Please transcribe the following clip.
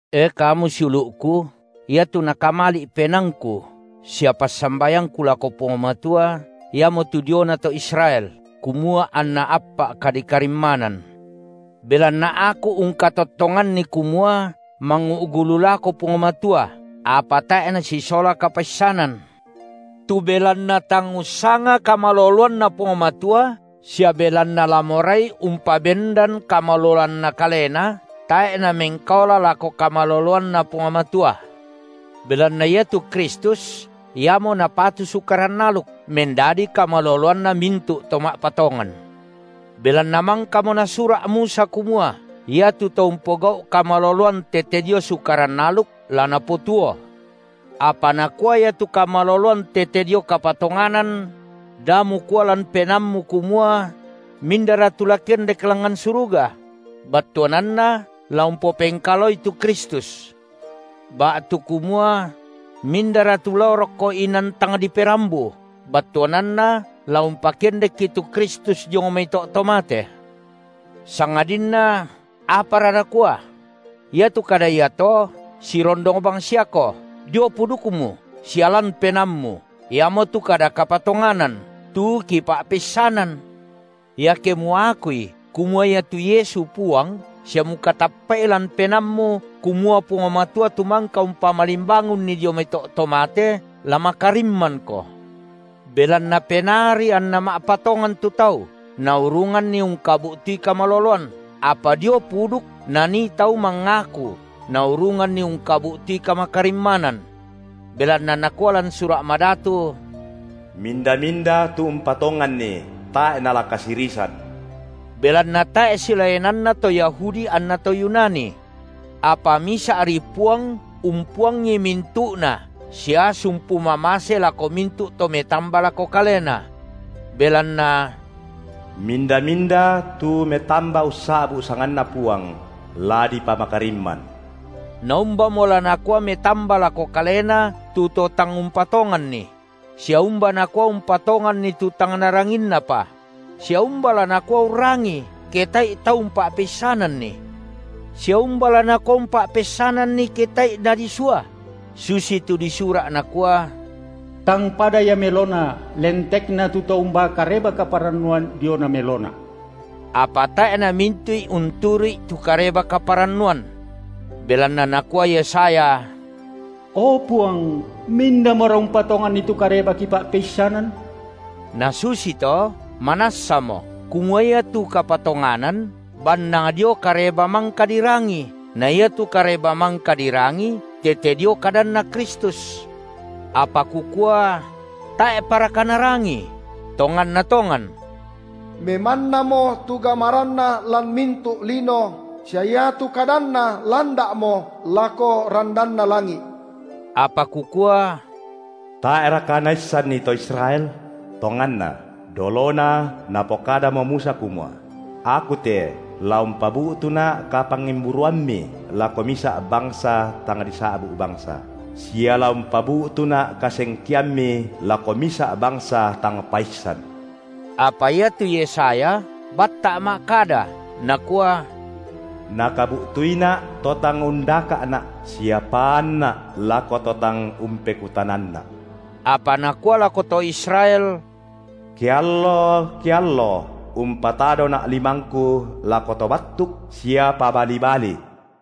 E kamu siulu’ku, iatu nakamali’ penaangku sia passambayangku lako Puang Matua, iamotu diona to Israel, kumua anna appa’ kadikarimmanan. Belanna aku ungkatottonganni kumua mangu’gu lu lako Puang Matua, apa tae’ nasisola kapaissanan. Tu belanna tang ussanga kamaloloanNa Puang Matua, sia belanna la morai umpabendan kamaloloanna kalena, tae’ namengkaola lako kamaloloanNa Puang Matua. Belanna iatu Kristus Iamo napatu Sukaran aluk, mendadi kamaloloanna mintu’ to ma’patongan. Belanna mangkamo nasura’ Musa kumua iatu to umpogau’ kamaloloan tete dio Sukaran aluk la napotuo. Apa nakua ia tu kamaloloan tete dio kapatonganan: Da mukua lan penaammu kumua: Mindara tu la kendek langngan suruga?, battuananna la umpopengkalaoi tu Kristus. Ba’tu kumua: Mindara tu lao rokko inan tang diperambu, battuananna la umpakendekki tu Kristus diong mai to’ to mate. Sangadinna apara nakua? Iatu kada iato sirondong bangsiako, dio pudukmu sia lan penaammu, iamotu kada kapatonganan, tu kipa’peissanan. Iake muakui kumua iatu Yesu Puang, sia mukatappa’i lan penaammu kumua Puang Matua tu mangka umpamalimbangunNi dio mai to’ to mate, la makarimmanko. Belanna penaari anna ma’patongan tu tau naurunganni ungkabu’tui kamaloloan, apa dio puduk nanii tau mangaku naurunganni ungkabu’tui kamakarimmanan. Belanna nakua lan Sura’ Madatu: Minda-minda tu umpatonganni, tae’ nala kasirisan. Belanna tae’ silaenanna to Yahudi anna to Yunani. Apa misa’ri Puang umpuangi mintu’na sia sumpu mamase lako mintu’ to metamba lako Kalena. Belanna, minda-minda tu metamba ussa’bu’ sanganNa Puang, la dipamakarimman. Naumbamo la nakua metamba lako Kalena tu to tang umpatonganni? sia umba nakua umpatonganni tu tang naranginnapa? sia umba la nakua urrangii, ke tae’i tau umpa’peissananni? Sia umba la nakua umpa’peissananni, ke tae’i nadisua? Susi tu disura’ nakua: Tang pada ia melona lentekna tu to umbaa Kareba-kaparannuan diona melona. Apa tae’ namintu’i unturu’i tu Kareba-kaparannuan. Belanna nakua Yesaya: O Puang, mindamora umpatonganni tu kareba kipa’peissanan? Na susito, manassamo kumua iatu kapatonganan bannang dio kareba mangka dirangi, na iatu kareba mangka dirangi tete dio kadanNa Kristus. Apa kukua: Tae’paraka narangii? Tonganna tongan! Memannamo tu gamaranna lan mintu’ lino, sia iatu kadanna landa’mo lako randanna langi’. Apa kukua: Tae’raka naissanni to Israel? Tonganna, dolona napokadamo Musa kumua: Aku te la umpabu’tuNa’ kapangimburuammi lako misa’ bangsa tang disa’bu’ bangsa, sia la umpabu’tuNa’ kasengkeammi lako misa’ bangsa tang paissan. Apa iatu Yesaya batta’ ma’kada, nakua: Nakabu’tuiNa’ to tang undaka’Na’ sia paanNa’ lako to tang umpekutananNa’. Apa nakua lako to Israel: Keallo-keallo umpatadoNa’ limangKu lako to battuk sia pabali-bali.